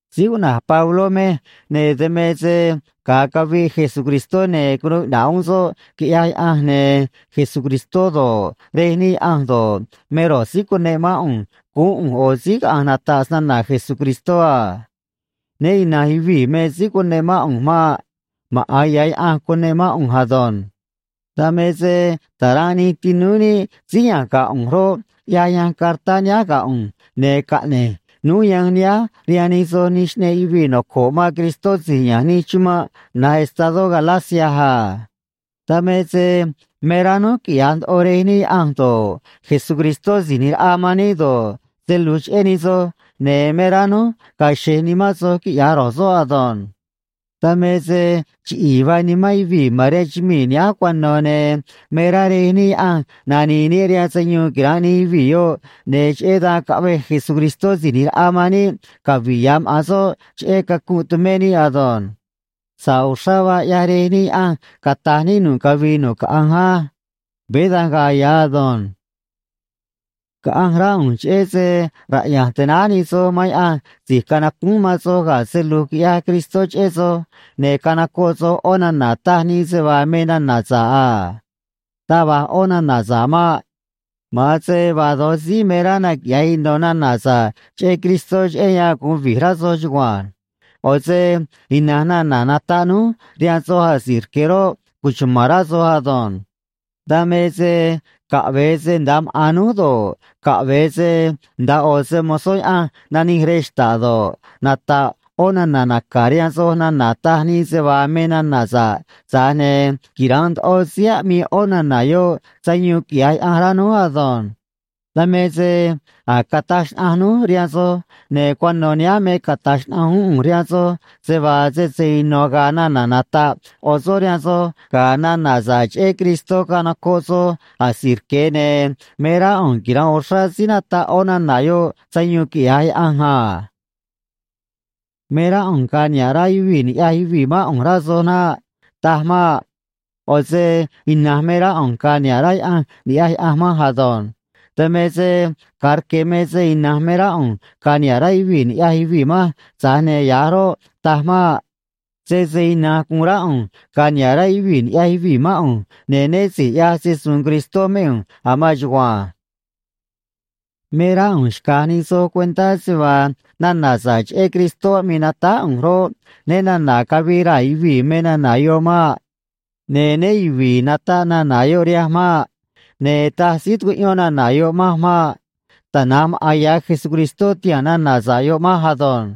Síí cuꞌna̱j Pabló mej, ne̱ dan me se ga̱a caviꞌ Jesucristó, ne̱ cunuu iꞌna̱ꞌ uún soꞌ, quiꞌyaj Yaꞌanj, ne̱ Jesucristó do̱ꞌ, Rej níꞌ Yaꞌanj do̱ꞌ, me ro̱j síí cuneꞌ mán ꞌu̱nj guún ꞌu̱nj ꞌo̱ síí caꞌa̱nj nata̱ꞌ snana̱ Jesucristó a. Né ina̱nj yuvii̱ me síí cuneꞌ mán ꞌu̱nj maꞌ. Maꞌa̱n ya̱ Yaꞌanj cuneꞌ mán ꞌu̱nj ado̱nj. Dan me se ta̱ranꞌ nij tinúú níꞌ síí ya̱nj ga̱ ꞌu̱nj roꞌ, ꞌyaj yanj cartá nihánj ga̱ ꞌu̱nj, ne̱ caꞌne̱j núj yanj nihánj rihaan nij soj nij xꞌneꞌ yuvii̱ noco̱ꞌ man Cristó si̱j ya̱nj nij chumanꞌ na̱j estadó Galacia a. Dan me se me rá núj quiꞌya̱j ndoꞌo Rej níꞌ Yaꞌanj do̱ꞌ, Jesucristó Si̱j ꞌNi̱j Raꞌa man níꞌ do̱ꞌ, se lu̱j cheꞌé nij soj, ne̱ me rá núj ga̱a̱ xe̱j nimán soj quiꞌya̱j ro̱j soꞌ ado̱nj. Dan me se chiꞌi̱i̱ vaa nimán yuvii̱ ma̱n rihaan chumii̱ nihánj cuano̱, ne̱ me rá Rej níꞌ Yaꞌanj nani̱i̱ níꞌ rihaan sayuun quira̱nꞌ nij yuvii̱ yoꞌ, ne̱ cheꞌé dan caꞌvej Jesucristó Si̱j ꞌNi̱j Raꞌa man níꞌ cavi̱ꞌ ya̱ maꞌa̱n soꞌ cheꞌé cacunꞌ tumé níꞌ ado̱nj. Sa̱ꞌ uxrá vaa ꞌyaj Rej níꞌ Yaꞌanj, cata̱j níꞌ nu̱ꞌ cavii nu̱ꞌ caꞌanj á. Veé da̱nj ga̱a̱ ya̱ ado̱nj. Caꞌanj rá ꞌu̱nj cheꞌé se raꞌya̱nj tanáj nij soj man Yaꞌanj si̱j canacúún man soj ga̱ se lu̱j quiꞌyaj Cristó cheꞌé soj, ne̱ canocoꞌ soj ꞌó nana̱ taj nii se vaa me nana̱ sa̱ꞌ a. Taj va̱j ꞌó nana̱ sa̱ꞌ maꞌ. Ma̱an se vaa do̱j síí me rá naquiꞌya̱j ino̱ nana̱ sa̱ꞌ cheꞌé Cristó cheꞌé yan gu̱un vi̱j rá soj chugua̱nj. ꞌO̱ se ina̱nj nana̱ nataꞌ núj rihaan soj asi̱j rque̱ roꞌ, cuchuma̱n rá soj ado̱nj. Dan me se caꞌve̱e se nda̱a maꞌa̱n núj do̱ꞌ, caꞌve̱e se nda̱a ꞌo̱ se‑mo̱zó Yaꞌanj nanij rej xta̱ꞌ do̱ꞌ, nata̱ꞌ ꞌó nana̱ naca̱ rihaan soj nana̱ taj nii se vaa me nana̱ sa̱ꞌ, tza̱j ne̱ quira̱nꞌ ndoꞌo síí aꞌmii ꞌó nana̱ yoꞌ sayuun quiꞌya̱j Yaꞌanj rá núj ado̱nj. Dan me se a̱j cataj xnaꞌanj núj rihaan soj, ne̱ cuano̱ nihánj me cata̱j xnaꞌanj uún ꞌu̱nj rihaan soj, se vaa sese ino̱ ga̱a̱ nana̱ nata̱ꞌ ꞌo̱ soꞌ rihaan soj ga̱ nana̱ sa̱ꞌ cheꞌé Cristó canocoꞌ soj asi̱j rque̱, ne̱ me rá ꞌu̱nj quira̱nꞌ uxrá síí nataꞌ ꞌó nana̱ yoꞌ sayuun, quiꞌya̱j Yaꞌanj a. Me rá ꞌu̱nj ga̱a̱ niha̱ꞌ rá yuvii̱ ni̱ꞌyaj yuvii̱ mán ꞌu̱nj, rá soj naꞌ. Taj maꞌ. ꞌO̱ se ina̱nj me rá ꞌu̱nj ga̱a̱ niha̱ꞌ rá Yaꞌanj ni̱ꞌyaj Yaꞌanj manj ado̱nj. Dan me se ga̱a rque̱ me se ina̱nj me rá ꞌu̱nj ga̱a̱ niha̱ꞌ rá yuvii̱ ni̱ꞌyaj yuvii̱ manj, tza̱j ne̱ ya̱j roꞌ, taj maꞌ. Sese ina̱nj gu̱un rá ꞌu̱nj ga̱a̱ niha̱ꞌ rá yuvii̱ ni̱ꞌyaj yuvii̱ mán ꞌu̱nj, ne̱ né si̱j ꞌyaj se‑su̱u̱n Cristó mé ꞌu̱nj a̱ maan chugua̱nj. Me rá ꞌu̱nj xca̱j nij soj cuentá se vaa nana̱ sa̱ꞌ cheꞌé Cristó aꞌmii natáj ꞌu̱nj roꞌ, né na̱na̱ cavii raa̱ yuvii̱ me nana̱ yoꞌ maꞌ. Ne̱ né yuvi̱i̱ nataꞌ nana̱ yoꞌ rihanj maꞌ. Ne̱ taj síí tucuꞌyón nana̱ yoꞌ manj maꞌ. Tana̱nj maꞌa̱n ya̱ Jesucristó tihaa̱n nana̱ sa̱ꞌ yoꞌ manj ado̱nj.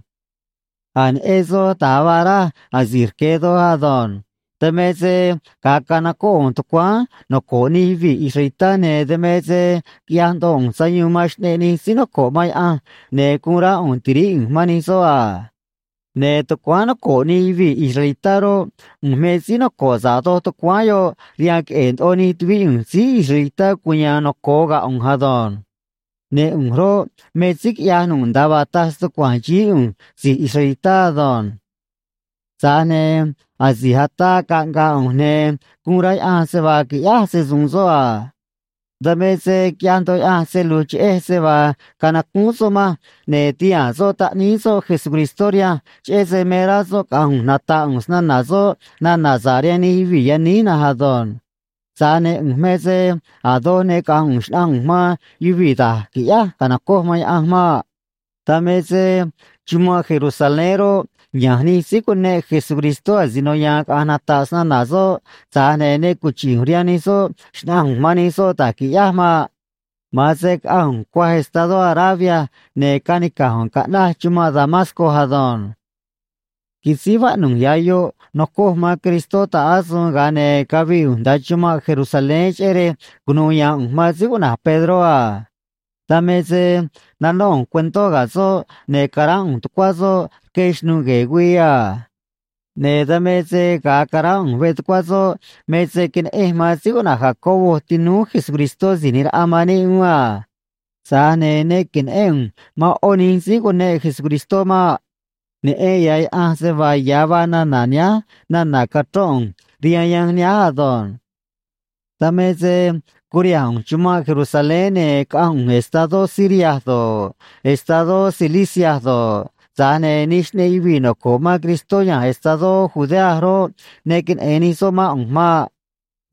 A̱j neꞌen soj da̱j vaa raj asi̱j rque̱ doj ado̱nj. Dan me se ga̱a canocóꞌ ꞌu̱nj tucuáán noco̱ꞌ nij yuvii̱ israelitá, ne̱ dan me se quiꞌyaj ndoꞌo ꞌu̱nj sayuun man xꞌneꞌ nij síí noco̱ꞌ man Yaꞌanj, ne̱ guun rá ꞌu̱nj ti̱ríꞌ ꞌu̱nj man nij soꞌ a. Ne̱ tucuáán noco̱ꞌ nij yuvii̱ israelitá roꞌ, ꞌu̱nj me síí noco̱ꞌ sa̱ꞌ doj tucuáán yoꞌ rihaan queꞌe̱e̱ ndoꞌo nij tuvíꞌ ꞌu̱nj síí israelitá cuya̱a̱n noco̱o ga̱ ꞌu̱nj ado̱nj. Ne̱ ꞌu̱nj roꞌ, me síí quiꞌyaj nu̱ꞌ nda̱a vaa taj stucua̱nj xií ꞌu̱nj si̱j israelitá ado̱nj. Tza̱j ne̱ asi̱j ataa caꞌnga̱a̱ ꞌu̱nj, ne̱ guun rá Yaꞌanj se vaa qui̱ꞌyáj se‑su̱u̱n soꞌ a. Dan me se quiꞌyaj ndoꞌo Yaꞌanj se lu̱j cheꞌej se vaa canacúún soꞌ manj, ne̱ tihaa̱n soꞌ Taꞌníí soꞌ Jesucristó rihanj, cheꞌé se me rá soꞌ caꞌa̱nj ꞌu̱nj nata̱ꞌ ꞌu̱nj snana̱ soꞌ nana̱ sa̱ꞌ rihaan nij yuvii̱ yaníj na̱nj ado̱nj. Tza̱j ne̱ ꞌu̱nj me se a̱ doj ne caꞌa̱nj ꞌu̱nj xna̱ꞌanj ꞌu̱nj man yuvii̱ da̱j qui̱ꞌyáj ca̱nocoj man Yaꞌanj maꞌ. Dan me se chumanꞌ Jerusalén roꞌ, ya̱nj nij síí cuneꞌ Jesucristó asino ya̱a̱n caꞌa̱nj nata̱ꞌ snana̱ soꞌ, tza̱j ne̱ ne cuchi̱ꞌ ꞌu̱nj rihaan nij soꞌ xna̱ꞌanj ꞌu̱nj man nij soꞌ da̱j qui̱ꞌyáj maꞌ. Ma̱an se caꞌanj ꞌu̱nj cuaj estadó Arabia, ne̱ canica̱j ꞌu̱nj caꞌnaj chumanꞌ Damasco ado̱nj. Quisíj vaꞌnu̱j ya̱ yoꞌ nocoj man Cristó ta̱ꞌ asuun, ga̱a ne̱ cavii ꞌu̱nj nda̱a chumanꞌ Jerusalén, cheꞌé rej cunu̱u ya̱a̱n ꞌu̱nj man síí cuꞌna̱j Pedró a. Dan me se nanó ꞌu̱nj cuentó ga̱ soꞌ, ne̱ caránꞌ ꞌu̱nj tucuá soꞌ rque xnu̱ꞌ gue̱e̱ güii a. Ne̱ dan me se ga̱a caránꞌ ꞌu̱nj veꞌ tucuá soꞌ me se queneꞌenj man síí cuꞌna̱j Jacobo tinúú Jesucristó Si̱j ꞌNi̱j Raꞌa man níꞌ uún a. Tza̱j ne̱ ne que̱neꞌén ꞌu̱nj man ꞌó nij síí cuneꞌ Jesucristó maꞌ. Neꞌen ya̱ Yaꞌanj se vaa ya̱ vaa nana̱ nihánj nana̱ cachrón ꞌu̱nj rihaan yanj nihánj ado̱nj. Dan me se curiha̱nj ꞌu̱nj chumanꞌ Jerusalén, ne̱ caꞌanj ꞌu̱nj estadó Siria do̱ꞌ, estadó Cilicia do̱ꞌ, tza̱j ne̱ nij xꞌneꞌ yuvii̱ noco̱ꞌ man Cristó ya̱nj estadó Judea roꞌ, ne queneꞌe̱n nij soꞌ mán ꞌu̱nj maꞌ.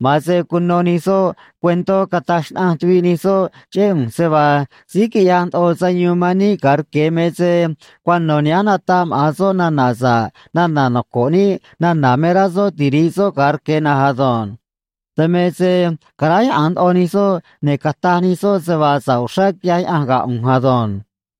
Ma̱an se cuno nij soꞌ cuentó cataj xnaꞌanj tuviꞌ nij soꞌ cheꞌé ꞌu̱nj se vaa: “Síí quiꞌyaj ndoꞌo sayuun man níꞌ ga̱a rque̱ me se cuano̱ nihánj nataꞌ maꞌa̱n soꞌ nana̱ sa̱ꞌ nana̱ noco̱ꞌ níꞌ nana̱ me rá soꞌ tiri̱ꞌ soꞌ ga̱a rque̱ na̱nj ado̱nj.” Dan me se caráyaꞌa̱nj ndoꞌo nij soꞌ, ne̱ cataj nij soꞌ se vaa sa̱ꞌ uxrá quiꞌyaj Yaꞌanj ga̱ ꞌu̱nj ado̱nj.